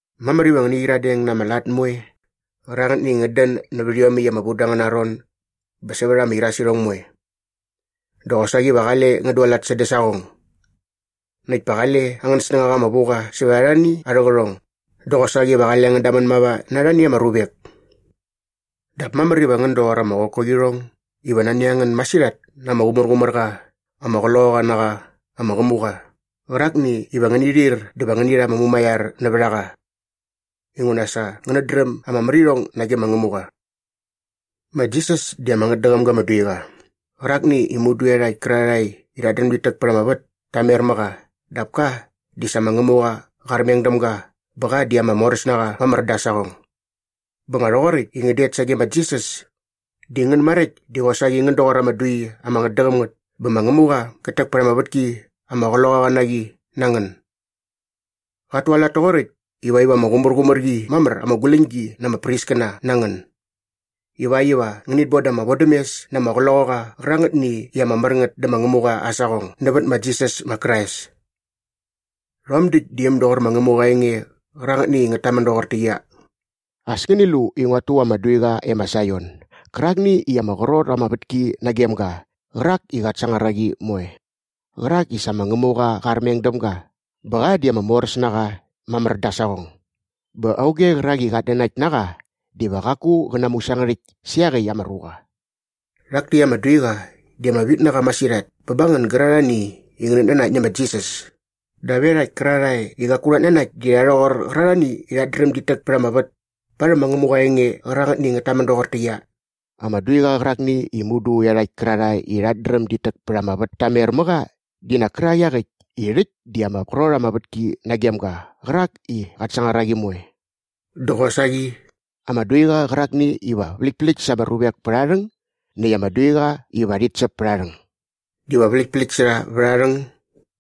Mamär iva ngäni qyiradeng na ama lat moe qärangätni i ngät dän nävät iomäkt i ama vu da angäna ron bä sävät ama irasirhong moe. Dä qosaqi va qale ngän dualat sädä saqong. Näkt pa qale angän snängaqa ama vu qa sävät arhani arhä qärhong dä qosaqi va qale ngän damän mava na arhani ama ruvek. Dap mamär iva ngän doqor ama qokoqirhong iva nani a ngän masirhat na ama qumärqumär qa ama qloqaqa na qa ama qämuqa qärakni iva ngäni ir dä va ngäni rha ama mumaiar nävät a qa inguna sa ngänät dräm ama märirhong nage ma Ngämuqa. Ma Jisas di ama ngätdäqäm ga ama duiqa qärakni i mudu iarhakt kärarhae i rhat dräm dit täk pät ama vät ta mer mä qa dap ka di sa ma Ngämuqa qa armeng däm ga bä qa di ama moräs na qa mamär da aa saqong. Bä nga rhoqoräkt i ngän det sage ma Jisas di ngän maräkt di qosaqi ngän doqor ama dui ama ngätdäqäm ngät bä ma Ngämuqa qät täk pät ama vätki ama qloqaqa na qi na ngän. Qat tualat toqoräkt ivakt iva ama qumärqumär qi mamär ama guläñgi na ama priskäna na ngän ivakt iva ngänit boda ama vodämes na ama qloqaqa qärangätni i ama mär ngät dä ma Ngämuqa aa saqong nävät ma Jisas ma Krais. Rhom däkt di äm doqor ma Ngämuqa aa enge qärangätni i ngät tamän doqortäqyia, “As ngäni lu i nguat tu ama duiqa e ma Saion gärakni i ama qrot ama vätki nagem ga qärak i qat sangar a qi moe qärak i sa ma Ngämuqa qa armeng däm ga bä qa di ama moräs na qa mamär da aa saqong bä auge qärak i qat nanakt na qa diva qaku qä namusangärhäkt sä iaqäkt ama ruqa.” Rhak täkt ama duiqa di ama vit na qa masirhat bä ba ngän gärarhae i ngänät nanakt nä ma Jisas dap iarhakt kärarhae i qaku rhat nanakt di rha rhoqor qärarhani i rhat dräm dit täk pät ama vät parhäm ma Ngämuqa aa enge qärangätni i ngät tamän doqortäqyia, “Ama duiqa qärakni i mudu iarhakt kärarhae i rhat dräm dit täk pät ama vät ta mer mä qa di nak kärak iaqäkt i rhäkt di ama qrot ama vätki nagem ga qärak i qat sangar a qi moe” dä qosaqi “ama duiqa qärakni iva vläktpläkt sa ama ruvek pät aa rhäng näkt ama duiqa iva rhit säp pät aa rhäng.” Diva vläktpläkt sa rha vät aa rhäng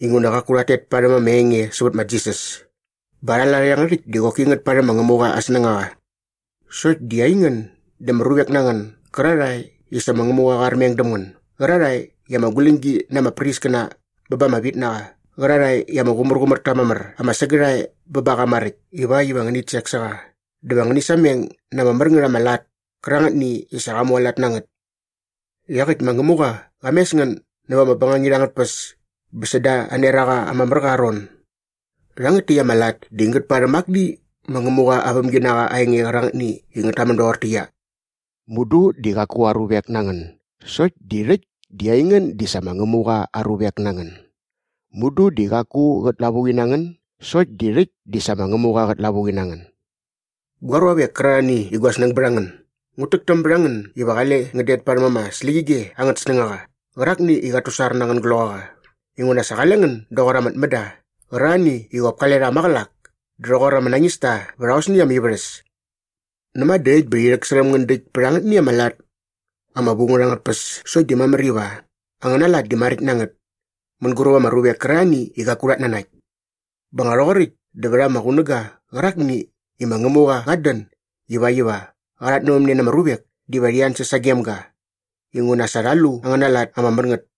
dinguna qaku rhat tet parhäm ama enge sävät ma Jisas bä arha lat iangärhäkt di qoki ngät parhäm ma Ngämuqa aa snängaqa. Sokt di aingän di ama ruvek na ngän gärarhae i sa ma Ngämuqa qa armeng däm ngän gärarhae i ama guläñgi na ama priskäna bä ba ama vitnaqa qärarhae i ama qumärqumär ta mamär ama sägärhae bä ba qa maräkt ivakt iva ngänit sek sä qa dä va ngäni sameng na ama mär ngät ama lat kärangätni i sa qa mualat na ngät. Iaqäkt ma Ngämuqa qa mes ngän näva ama bängangit angät tpäs bä säda aa neraqa ama mär qa mamär aa ron. Rhangät täkt ama lat di ngät parhäm akni ma Ngämuqa aa vämginaqa aa enge qärangätni i ngät tamän doqortäqyia, “Mudu di qaku aa ruvek na ngän sokt di rhäkt di aingän di sa ma Ngämuqa aa ruvek na ngän. Mudu di qaku qät lavuqi na ngän sokt di rhäkt di sa ma Ngämuqa qät lavuqi na ngän.” Gua ruavek kärarhani i gua snäng bät a ngän, ngut täktäm bät a ngän iva qale ngän det parhäm ama släqyige angät snängaqa qärakni i qat tusar na angän gloqaqa inguna sa qale ngän doqor ama tmända qärarhani i qop kale rha maqälak dä rhoqor ama nañista vät aosni ama ivärhäs. Näma dä äkt bä rhi rhäksärhäm ngän däkt bät angätni ama lat ama vu ngät angät tpäs sokt di mamär iva angäna lat di maräkt na ngät mänguräp ama ruvek kärarhani i qaku rhat nanakt. Bä nga rhoqoräkt dä vät ama qunäga qärakni i ma Ngämuqa qat dän ivakt iva qa rhatnävämne na ama ruvek diva rhi ansäs sagem ga inguna sa rha lu angäna lat ama mär ngät.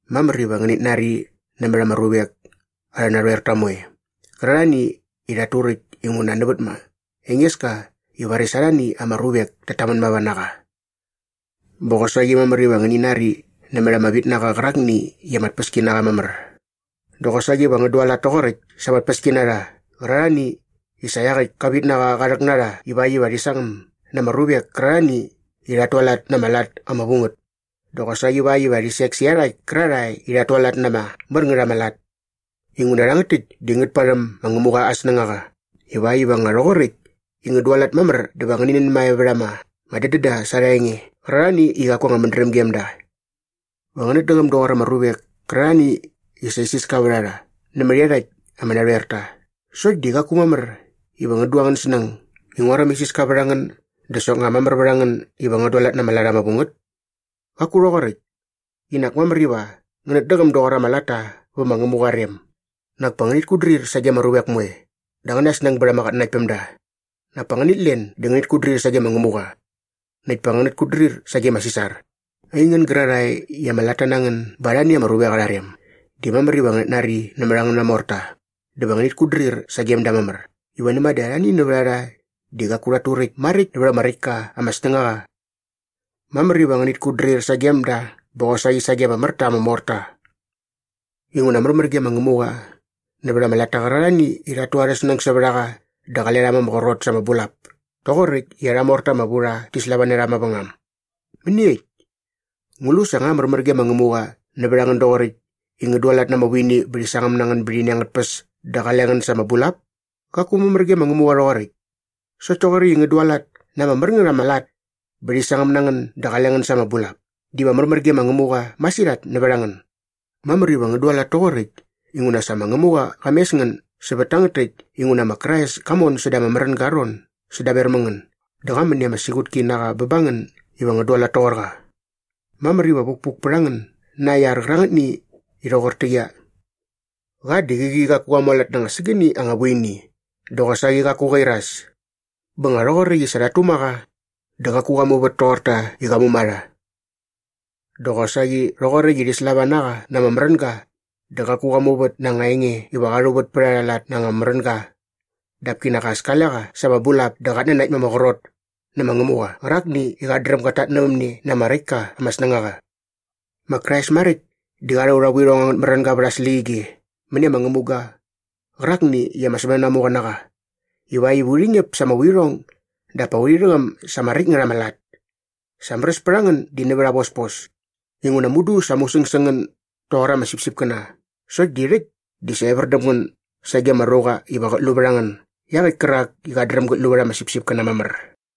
Mamär iva ngänät nari nämät ama ruvek arhä narhoerta moe qärarhani i rhat turäkt inguna nävät ma Engeska i varis arhani ama ruvek tat tamän mava na qa. Bä qosaqi mamär iva ngäni nari nämät ama vitnaqa qärakni i ama tpäskinaqa mamär dä qosaqi va ngän dualat toqoräkt sa ama tpäskinarha qärarhani i sa iaqäkt ka vitnaqa qa rhäk na rha ivakt iva rhi sangäm na ama ruvek kärarhani i rhat tualat na ama lat ama vu ngät dä qosaqi ivakt iva rhi sek sä iarhakt kärarhae i rhat tualat na ama mär ngät ama lat. Inguna rhangät täkt di ngät parhäm ma Ngämuqa aa snängaqa ivakt iva nga rhoqoräkt i ngän dualat mamär dä va ngäni nänmae vät ama dädända sa arha enge qärarhani i qaku anga mädräm gem da. Va ngänät däqäm doqor ama ruvek kärarhani i sa isiska vät a rha nämät iarhakt ama narhoerta sokt di qaku mamär iva ngän du angän snäng i nguaräm isiska vät a ngän dä soknga mamär vät a ngän iva ngän dualat na ama lat ama vu ngät. Qaku rhoqoräkt. Qinak mamär iva ngänät däqäm doqor ama latta vä ma Ngämuqa aa rem. Näkt pa ngänit kutdrir sage ama ruvek moe dä angäna snäng bät ama qatnanaktpämda. Nak pa ngänit len dä ngänit kutdrir sage ma Ngämuqa. Näkt pa ngänit kutdrir sage ma Sisar. Aingän gärarhae i ama latta na ngän ba arhani ama ruvek arha rem, di mamär iva ngänät nari nämät angäna morta dä va ngänit kutdrir sagem da mamär i näma dä arhani nävät a rha di qaku rhat turäkt maräkt nävät ama räkt ka ama snängaqa. Mamär iva ngänit kutdrir sagem da bä qosaqi sage ama mär ta ama morta. Inguna märmär ge ma Ngämuqa nävät ama latta qärarhani i rhat tu arhä snäng sävät a qa dä qale rha ma ama qrot sa ama bulap toqoräkt i arha morta ama vu rha rhi slava na rha mavängam. Mäniekt? Ngu lu sa nga märmär ge ma Ngämuqa nävät a ngän doqoräkt i ngän dualat na ama vuini bä rhi sangäm na ngän bät ini angät tpäs dä qale ngän sa ama bulap? Qaku märmär gem ga rhoqoräkt. Sokt toqoräkt i ngän dualat na ama mär ngät ama lat bä rhi sangäm na ngän dä qale ngän sa ama bulap diva märmär ge ma Ngämuqa masirhat nävät a ngän. Mamär iva ngän dualat toqoräkt inguna sa ma Ngämuqa qa mes ngän sävät tangät täkt inguna ma Krais ka mon säda ama märänga aa ron sädaver mä ngän dä qa män i ama siqutki na qa ba ngän iva ngän dualat toqor qa. Mamär iva vukpuk pät a ngän na aa iar qärangätni i rhoqortäqyia, Qa di qäqi qaku qa mualat na anga sägäni anga vuini dä qosaqi qaku qa iras. Bä nga rhoqoräkt i sa rhat tuma qa dä qaku qa muvät toqor ta i qa muma rha. Dä qosaqi rhoqoräkt i rhi slava na qa na ama märänga dä qaku qa muvät na anga enge iva qa rhuvät pät arha lat na anga märänga dap kinak as kale qa sa ama bulap dä qat nanakt ma ama qrot nä ma Ngämuqa qärakni i qat dräm gat tatnävämne na ama räkt ka ama snängaqa. Ma Krais maräkt di qa rha aurha vuirhong angät märänga vät aa släqyige mäni ama ngämuga qärakni i ama sämänanamuqa na qa ivakt iva urhi ñäp sa ama vuirhong dap pa urhi rhäqäm sa ama räkt ngät ama lat. Sa märäs pät a ngän di nävät aa vospos inguna mudu sa musäng sä ngän doqor ama sipsipkäna sokt di rhäkt dä sa evär däm ngän sage ama ruqa iva qät lu vät a ngän iaqäkt kärak i qat dräm gät lu vät ama sipsipkäna mamär.